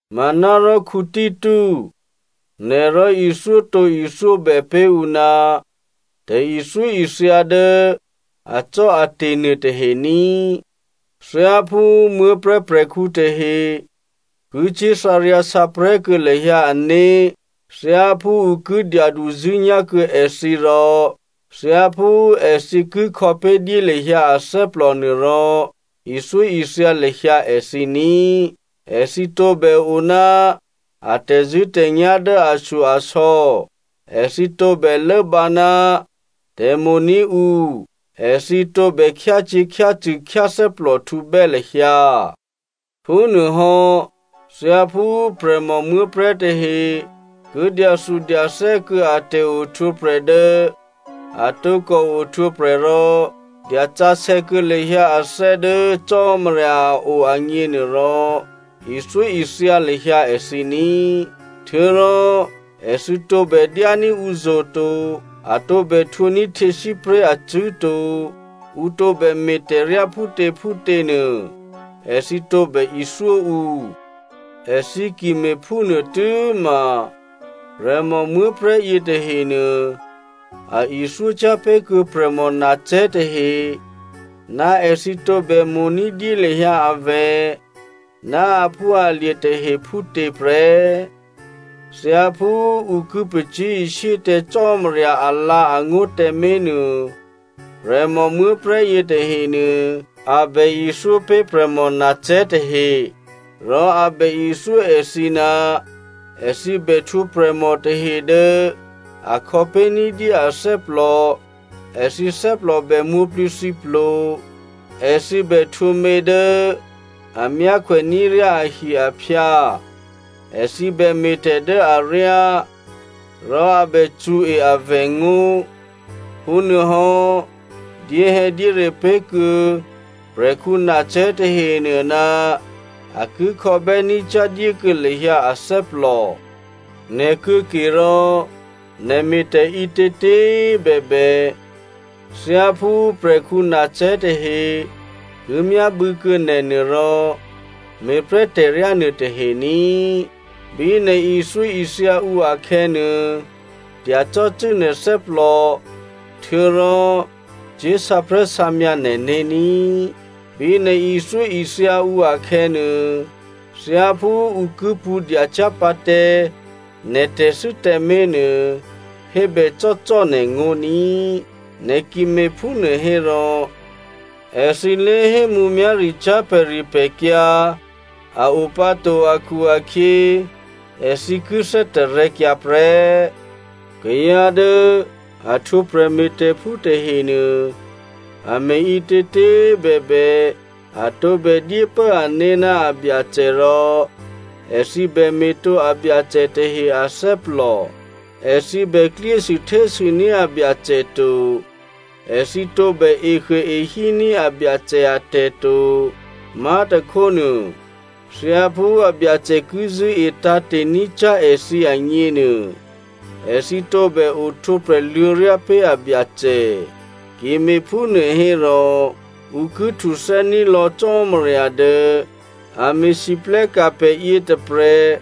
Manárò Tito, nè̤ rò ithyótǒithyóbè pé̤ ǔ ná tè̤ithyóithya dố acò́ate̤ nuôtahe ní꤮. Thyáphú muố̤prè̤́ prè̤khǔ tahe ki cyé̤ thǎryǎsǎprè̤́ kuô̌ lahyǎ ané̤, thyáphú ǔ ki dyaduzṳ̂́nyá̤ kuô̌ èthǐ, rò thyáphú èthǐ ki khò̌pé̤dyé lahyǎ athè́plò nuôrò, ithyóithya lahyǎ èthǐ ní꤮. Èthǐ tǒbè o ná a tè̤zṳ̂́tè̤nyá̤ dố ashyo-asò̌, èthǐ tǒbè lốbǎ ná tè̤mo̤ní̤ǔ, èthǐ tǒbè khyácyě̤khyácṳ̂ khyáthè́plòhtǔbè́ lahyǎ. Phúnuôhò́, thyáphú prè̤mò muố̤prè̤́ tahe ki dyathudyathè́ kuô̌ a tè̤ohtwǒprè̤ dố a tǒkò ohtwǒprè̤ rò dyasǎsè̌ kuô̌ lahyǎ athè́ dố Cò́marya a o agněnuôrò, ithyóithya lahyǎ èthǐ ní꤮. Htuô̌rò èthǐ tǒbè dyání̤ ǔzo̤ to, a tǒbè htwǒní̤ htyěsípré̤ acṳ̂́ to. Ǔ tǒbè me̤tè̤ryá phútěphútě nuô, èthǐ tǒbè ithyó ǔ. Èthǐ ki me̤phúnuô tû́ma prè̤mò muố̤prè̤́ yětahenuô, a ithyócyá̤ pé̤kuô̌ prè̤mò nacè̤́ tahe ná èthǐ tǒbè mo̤ ní̤dyé lahyǎ avè̤ ná aphúalye̤ tahe phútě prè́. Thyáphú ǔ ki pacyé̤ishyé tǎ Cò́marya alǎ̤angó̤ tǎmé̤nuô, prè̤mò muố̤prè̤́ yětahenuô, a bè ithyópé̤ prè̤mò nacè̤́ tahe. Rò a bè ithyó èthǐ ná èthǐ bè htwǒ prè̤mò tahe dố a khò̌pé̤ ní̤dyé athè́plò, èthǐ thè́plò bè mwǒ̤plǐthǐplo, èthǐ bè htwǒ mě dố a myákhwè ní̤ ryá ahi-aphyǎ, èthǐ bè me̤tè̤ dố aryá, rò a bè cṳ̌e avè̤ ngó̤. Phúnuôhò́, dyéhè̌dyére pé̤kuô̌ prè̤khǔ nacè̤́ tahenuô ná a ki khò̌bè́ ní̤cyá̤ dyékuô̌ lahyǎ athè́plò. Nè̤ kuô̌kerò, nè̤ me̤tè̤ ǐtětě꤮ bèbè, thyáphú prè̤khǔ nacè̤́ tahe ki myábû̌kuô̌ nè̤nuô rò, me̤ prè́ tè̤ryá nuôtahe ní꤮. Bí nè̤ ithyóithya ǔ akhè̌nuô, dyacò́cû́ nè̤ thè́plò htuô̌rò cyé̤ sǎprè̤́sǎmyǎ nè̤né̤ ní꤮. Bí nè̤ ithyóithya ǔ akhè̌nuô, thyáphú ǔ ki pṳ̌ dyacyá̤ pǎ tǎ nè̤ tè̤thû́ tǎmé̤nuô, hébècò́cò́꤮ nè̤ngó̤ ní꤮. Nè̤ ki me̤phúnuô hérò èthǐ lé̤hé mǔmyá̤ricyá̤ pè̤ripè̤kyǎ a o pǎ to akhu-akhyě, èthǐ ki thè́tarè̤̌kyǎ prè́. Kayǎ dố a htwǒ prè̤me̤tè̤phú tahenuô a me̤ ǐtětě꤮ bèbè, a tǒbè dyépố ané̤ ná abyacè rò èthǐ bè me̤tǒ abyacè tahe athè́plò. Èthǐ bè klyésû htésûní̤ abyacè to, èthǐ tǒbè ehuôehíní̤ abyacè atè̤ to, má̤tôkhónuô, thyáphú abyacè ki zṳ̂́e tǎ̤te̤ ní̤cyá̤ èthǐ agněnuô, èthǐ tǒbè ohtwǒprè̤ luô̌ryá pé̤ abyacè. Ki me̤phúnuô hérò ǔ ki htuthè́ní̤ lò̌ Cò́marya dố a me̤lwóhteka̤ pè̤ yětôprè̤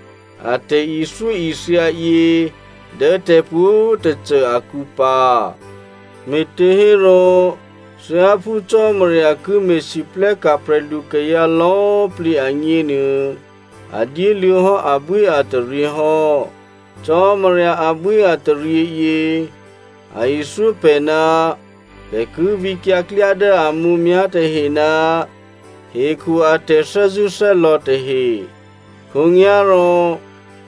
a tè̤ithyóithya yě dố tè̤pwǒ̤꤮ tôcô akǔ pǎ. Me̤těhérò thyáphú Cò́marya ki me̤lwóhteka̤ prè̤lukayǎ lò̌꤮ plǐ agněnuô, a dyéluô̌hò́ abwíataryě hò́. Cò́marya abwíataryěyě, a ithyó pè̤ ná pè̤ ki vǐkyǎ klyá dố a mǔmyá̤ tahe ná hekhu a tè̤thè́zṳ̂́thè́lò̌ tahe. Khǒnyá̤rò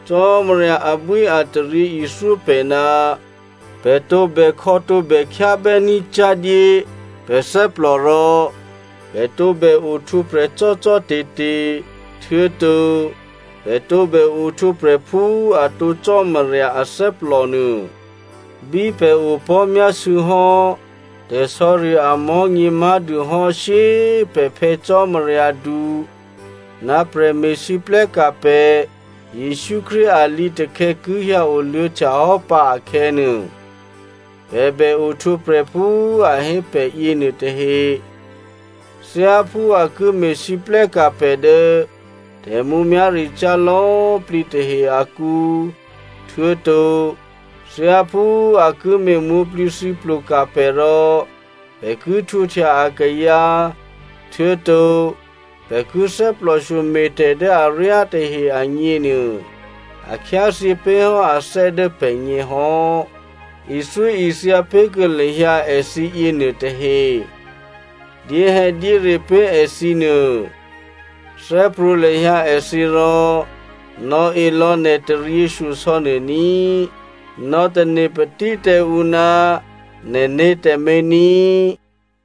Cò́marya abwíataryě ithyó pè̤ ná pè̤ tǒbè khò̌ tǒbè khyábè́ ní̤cyá̤dyé pè̤ thè́plò rò pè̤ tǒbè ohtwǒprè̤ cò́cò́te̤te̤, htuô̌to pè̤ tǒbè ohtwǒprè̤ phú atǒ Cò́marya athè́plò nuô. Bí pè̤ opò̤́myásû̌ hò́ tè̤sò̌ri amò̤́nyě má̤dûhò́ shyé꤮ pè̤ Phè̌ Cò́marya du ná prè̤me̤lwóhteka̤ pè̤ Jesǔ Krístu a lǐtakhè̌ ki hyǎ oluô̌htya hò́ pǎ akhè̌nuô, pè̤ bè ohtwǒprè̤ phú a hé pè̤ yěnuô tahe. Thyáphú a ki me̤lwóhteka̤ pè̤ dố tè̤mǔmyá̤ricyá̤ lò̌꤮ plǐ tahe akǔ, htuô̌to thyáphú a ki me̤ mwǒ̤plǐthǐplo ka̤ pè̤ rò pè̤ ki htwǒhtya akayǎ htuô̌to pè̤ ki thè́plòshyo me̤tè̤ dố aryá tahe agněnuô, a khyáthyě pé̤ hò́ athè́ dố pè̤gně hò́. Ithyóithya pé̤kuô̌ lahyǎ èthǐ yěnuôtahe. Dyéhè̌dyére pé̤ èthǐnuô. Thè́prwǒ̤ lahyǎ èthǐ rò nò̌e lò̌ nè̤ taryěshyosò̌ nuô ní꤮. Nò̌tane̤patí tǎ ǔ ná nè̤né̤ tǎmé̤ ní꤮.